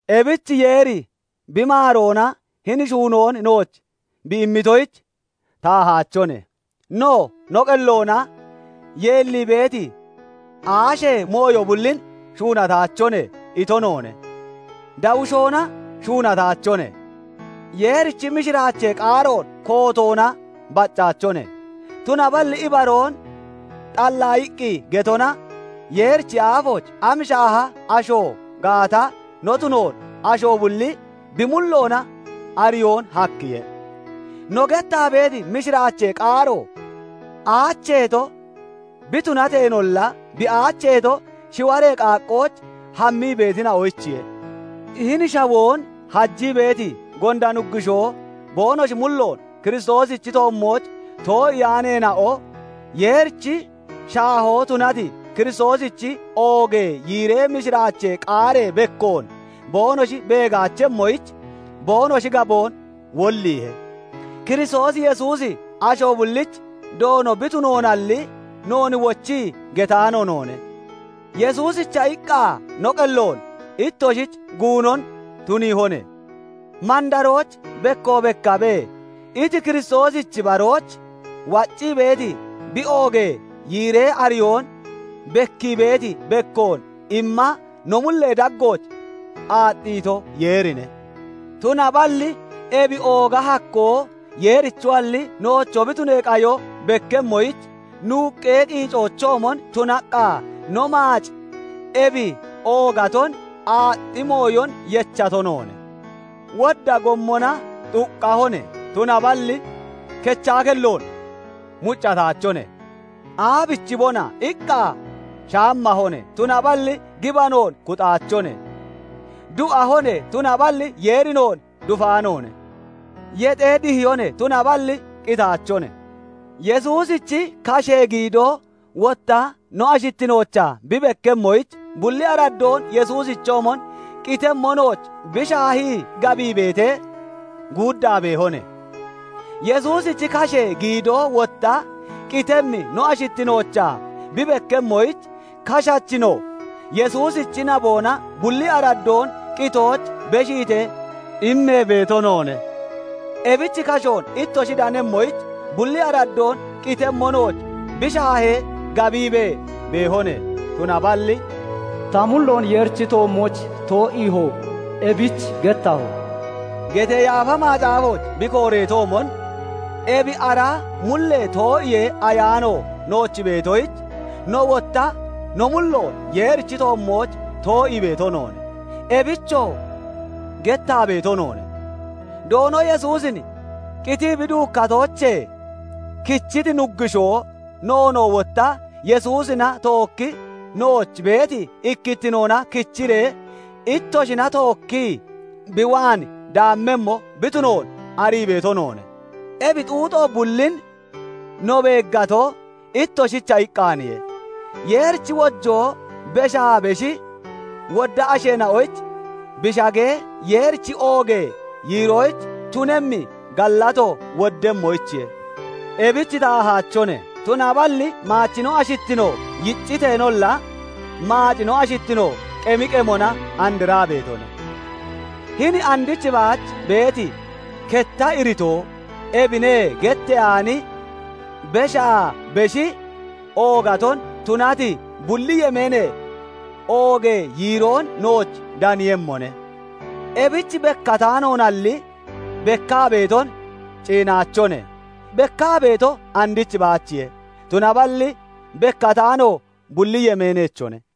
Ebich Yeeri bi maaroona hini shuunoon nooch bi immitoyich taahaachone. No no qelloona yeellii beeti aashee mooyo bullin Shuunataachone ito noone; dawushoona shuunataachone; Yeerichi mishiraachee qaaroon kootoona baccaachone; tunaballi ibaroon xallaayiqqi getona Yeerichi aafooch am shaaha asho gaata no tunoon asho bulli bi mulloona ariyoon hakkiye. No gettaa beeti mishiraachee qaaro aacheeto bi tunateenolla, bi aacheeto, shiwaree qaaqqooch hammii beetina'oyichiye. Hini shawoon hajii beeti gonda nuggushoo boonoshi mulloon Kiristoosichi toommooch too'iyaaneena'o Yeerichi shaahoo tunati Kiristoosichi oogee yiiree mishiraachee qaaree bekkoon boonoshi beegaachemmoyich, boonoshi gaboon wolliihe. Kiristoos Yesuusi asho bullichi Doono bi tunoonalli, noon wochii getaano noone; Yesuusicha iqqa no qelloon ittoshich guunon tuniihone. Mandarooch bekko bekkabe! iti, Kiristooshichi barooch waccii beeti bi oogee yiiree ariyoon bekkii beeti bekkoon imma no mullee daggooch aaxxiito, Yeerine. Tunaballi ebi ooga hakkoo Yeerichoalli, noocho bi tunee qayo bekkemmoyich, nuuqqee qiicoochoomon tunaqqa no maac ebi oogaton aaxxi mooyon yechato noone. Wodda gommona xuqqahone; tunaballi kechaa kelloon muccataachone; Aabichibona? iqqa shaammahone; tunaballi gibanoon kuxaachone; du'ahone; tunaballi Yeeri noon dufaanoone; yexee dihiyone; tunaballi qitaachone; Yesuusichi kashee giidoo wotta no ashittinoochaa bi bekkemmoyich, bulli araddoon Yesuusichoomon qitemmo nooch bi shaahee gabiibee guuddaa beehone. Yesuusichi kashee giidoo wotta qitemmi no ashittinoochaa bi bekkemmoyich, kashachi no, Yesuusichi naboona bulli araddoon qitooch beshiitee immee beeto noone. Ebich kashoon ittoshi danemmoyich, bulli araddoon qitemmo nooch bi shaahee gabiibee beehone. Tunaballi "Ta mulloon Yeerichi toommooch too'iiho; ebich gettaho" getee Yaafa Macaafooch bi kooreetoomon, ebi ara mullee too'iyee Ayaano nooch beetoyich, nowoo wotta no mulloon Yeerichi toommooch too'ii beeto noone; ebichoo gettaa beeto noone. Doono Yesuusin qitii bi duukkatoochee kichiti Nuggushoo, noonoo wotta Yesuusina tookkii nooch beeti ikkittinoona kichiree, ittoshina tookkii bi waan daammemmo bi tunoon arii beeto noone. Ebi xuuxo bullin no beeggato, ittoshicha iqqaaniye; Yeerichi wojoo beshaa beshi wodda asheena'oyich bi shagee, Yeerichi oogee yiiroyich tunemmi gallato woddemmoyichiye. Ebich taahaachone; tunaballi maachi no ashittino yicciteenolla, maaci no ashittino qemi qemona andraa beetone. Hini andich baach beeti ketta iritoo "Ebine" getteyaani beshaa beshi oogato tunati bulli yemeenee oogee yiiroon nooch daniiyemmone. Ebich bekkataanoonalli bekkaa beeton ciinaachone; bekkaa beeto andich baachiye; tunaballi bekkataano bulli yemeeneechone.